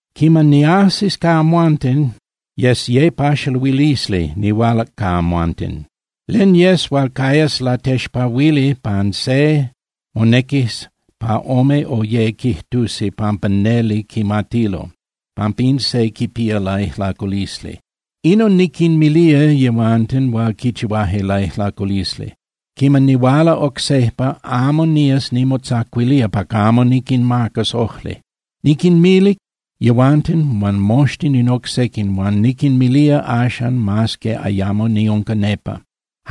Quiman niajsis ca amhuanten, yes ye paxaluilisli nihualac ca amhuanten. Len yes hual cayas latexpahuili pan se, monequis pa ome o ye quijtusi pampa neli quimatilo pampa in se quipía laijlaculisli. Inon niquinmilía yehuanten hual quichihuaje laijlaculisli: Quiman nihuala oc sejpa, amo nía nimotzacuilía pa camo niquinmacas ojli. Niquinmilic yehuanten huan moxtin in oc sequin, huan niquinmilía axan mas que ayamo niunca nepa.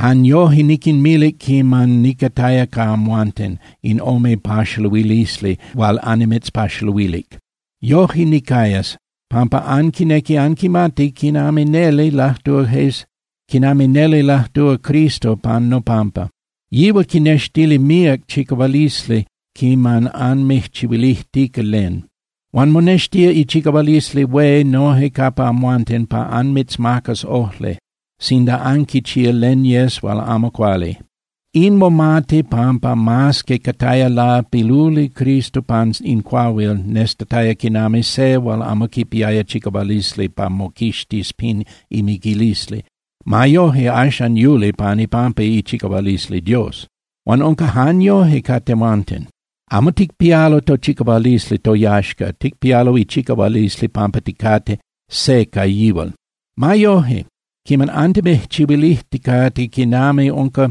Jan yoje niquinmilic quiman nicataya ca amhuanten in ome paxaluilisli hual annimitzpaxaluilic. Yoje nicayas, pampa anquinequi anquimati quinami neli lajtúa Cristo pan nopampa. Yihual quinextilía míac chicahualisli quiman anmijchihuilijtica len. Huan monextía ichicahualisli hué noje capa amhuanten pa anmitzmacas ojli sinda anquichía len yes hual amo cuali. In momati, pampa mas que cataya lapiluli Cristo pan in cuahuil nestataya quinami se hual amo quipiaya chicahualisli pa moquixtis pin imiquilisli, ma yoje axan yuli pan ipampa ichicahualisli Dios. Huan unca jan yoje ca tehuanten. Amo ticpialo tochicahualisli toyaxca. Ticpialo ichicahualisli pampa ticate se ca yihual. Ma yoje, quiman antimijchihuilijticate quinami unca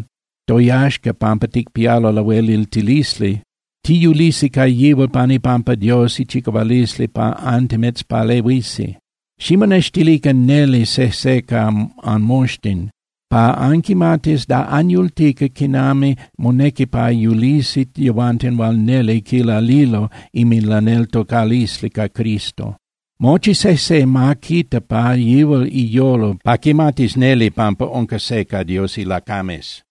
toyaxca pampa ticpialo lahueliltilisli, tiyulisi ca yihual pan ipampa Dios ichicahualisli pa antimitzpalehuisi. Ximonextilican neli sejse ca anmoxtin pa anquimatis da anyultica quinami monequi pa yulisi yehuanten hual neli quilalilo inminlaneltocalisli ca Cristo. Mochi sejse ma quita pa yihual iyolo pa quimatis neli pampa unca se ca Dios ilacames.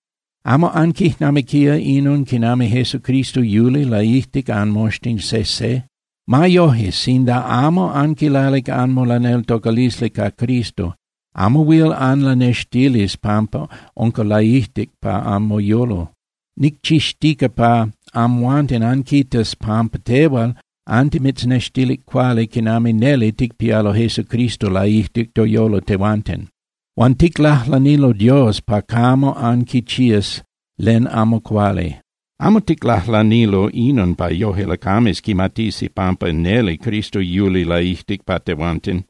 ¿Amo anquijnamiquía inon quinami Jesucristo yuli laijtic anmoxtin sejse? Ma yoje, sinda amo anquilalic anmolaneltocalisli ca Cristo, amo huil anlanextilis pampa unca laijtic pa anmoyolo. Nicchixtica pa amhuanten anquitas pampa tehuanten antimitznextilic cuali quinami neli ticpialo Jesucristo laijtic toyolo tehuanten. Huan ticlajlanilo Dios pa camo anquichías len amo cuali. Amo ticlajlanilo inon pa yoje lacames quimatisi pampa neli Cristo yuli laijtic pa tehuanten.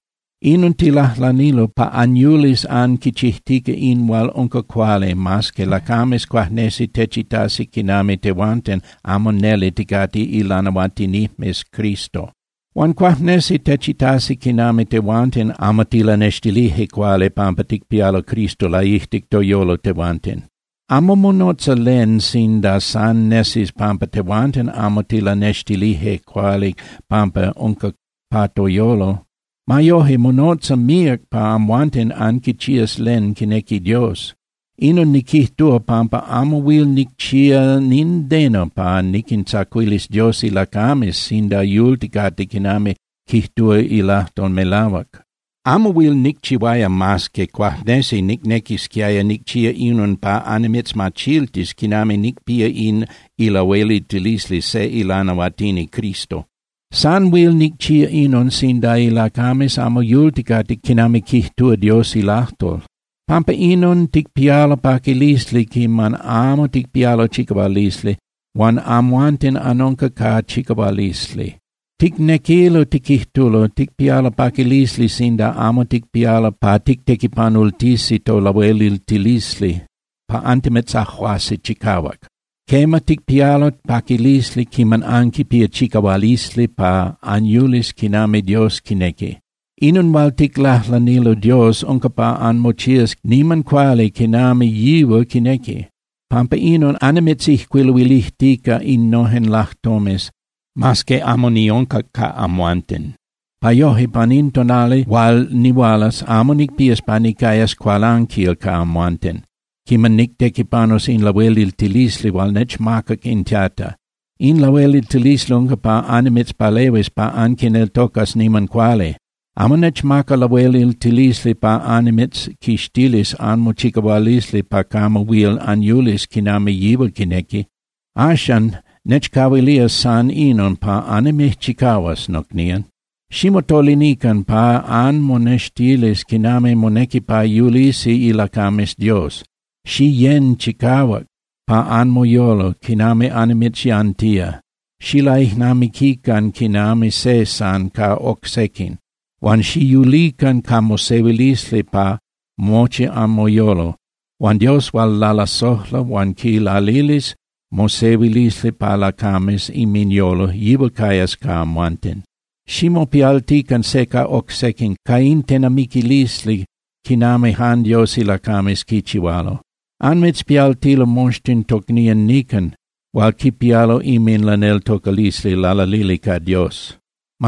Inon ticlajlanilo pa anyulis anquichijtica in hual unca cuali mas que lacames cuajnesi techitasi quinami tehuanten amo neli ticate ilanahuatinijmes Cristo. Huan cuajnesi techitasi quinami tehuanten amo tilanextilije cuali pampa ticpialo Cristo laijtic toyolo tehuanten. Amo monotza len sinda san nesis pampa tehuanten amo tilanextilije cuali pampa unca pa toyolo. Ma yoje, monotza míac pa amhuanten anquichías len quinequi Dios. Inon niquijtúa pampa amo huil nicchía nindeno pa niquintzacuilis Dios ilacames sinda yulticate quinami quijtúa ilajtol melahuac. Amo huil nicchihuaya mas que cuajnesi nicnequisquiaya nicchía inon pa annimitzmachiltis quinami nicpía in ilahueliltilisli se ilanahuatini Cristo. San huil nicchía inon sinda ilacames amo yulticate quinami quijtúa Dios ilajtol. Pampa inon ticpialo paquilisli quiman amo ticpialo chicahualisli huan amhuanten anunca ca chicahualisli. Ticnequilo tiquijtulo, ticpialo paquilisli sinda amo ticpialo pa tictequipanultisi tolahueliltilisli pa antimitzajuasi chicahuac. Quema, ticpialo paquilisli quiman anquipía chicahualisli pa anyulis quinami Dios quinequi. Inon hual ticlajlanilo Dios unca pa anmochías niman cuali quinami yihual quinequi. Pampa inon annimitzijcuiluilijtica innojen lajtomes mas que amo niunca ca amhuanten, pa yoje pan in tonali hual nihualas, amo nicpías pa nicayas cualanquil ca amhuanten quiman nictequipanus in lahueliltilisli hual nechmacac in Tata. In lahueliltilisli unca pa annimitzpalehuis pa anquineltocas niman cuali. Amo nechmacac lahueliltilisli pa annimitzquixtilis anmochicahualisli pa camo huil anyulis quinami yihual quinequi. Axan, nechcahuilía san inon pa annimijchicahuas, nocnían. Ximotolinican pa anmonextilis quinami monequi pa yulisi ilacames Dios. Xiyén chicahuac pa anmoyolo quinami annimitzyantía, xilaijnamiquican quinami se san ca oc sequin, huan xiyulican ca mosehuilisli pa mochi anmoyolo. Huan Dios hual lalasojla huan quinlalilis mosehuilisli pa lacames inminyolo, yihual cayas ca amhuanten. Ximopialtican se ca oc sequin ca in tenamiquilisli quinami jan Dios ilacames quichihualo. Anmitzpialtilo moxtin tocnían nican hual quipialo inminlaneltocalisli lalalili ca Dios.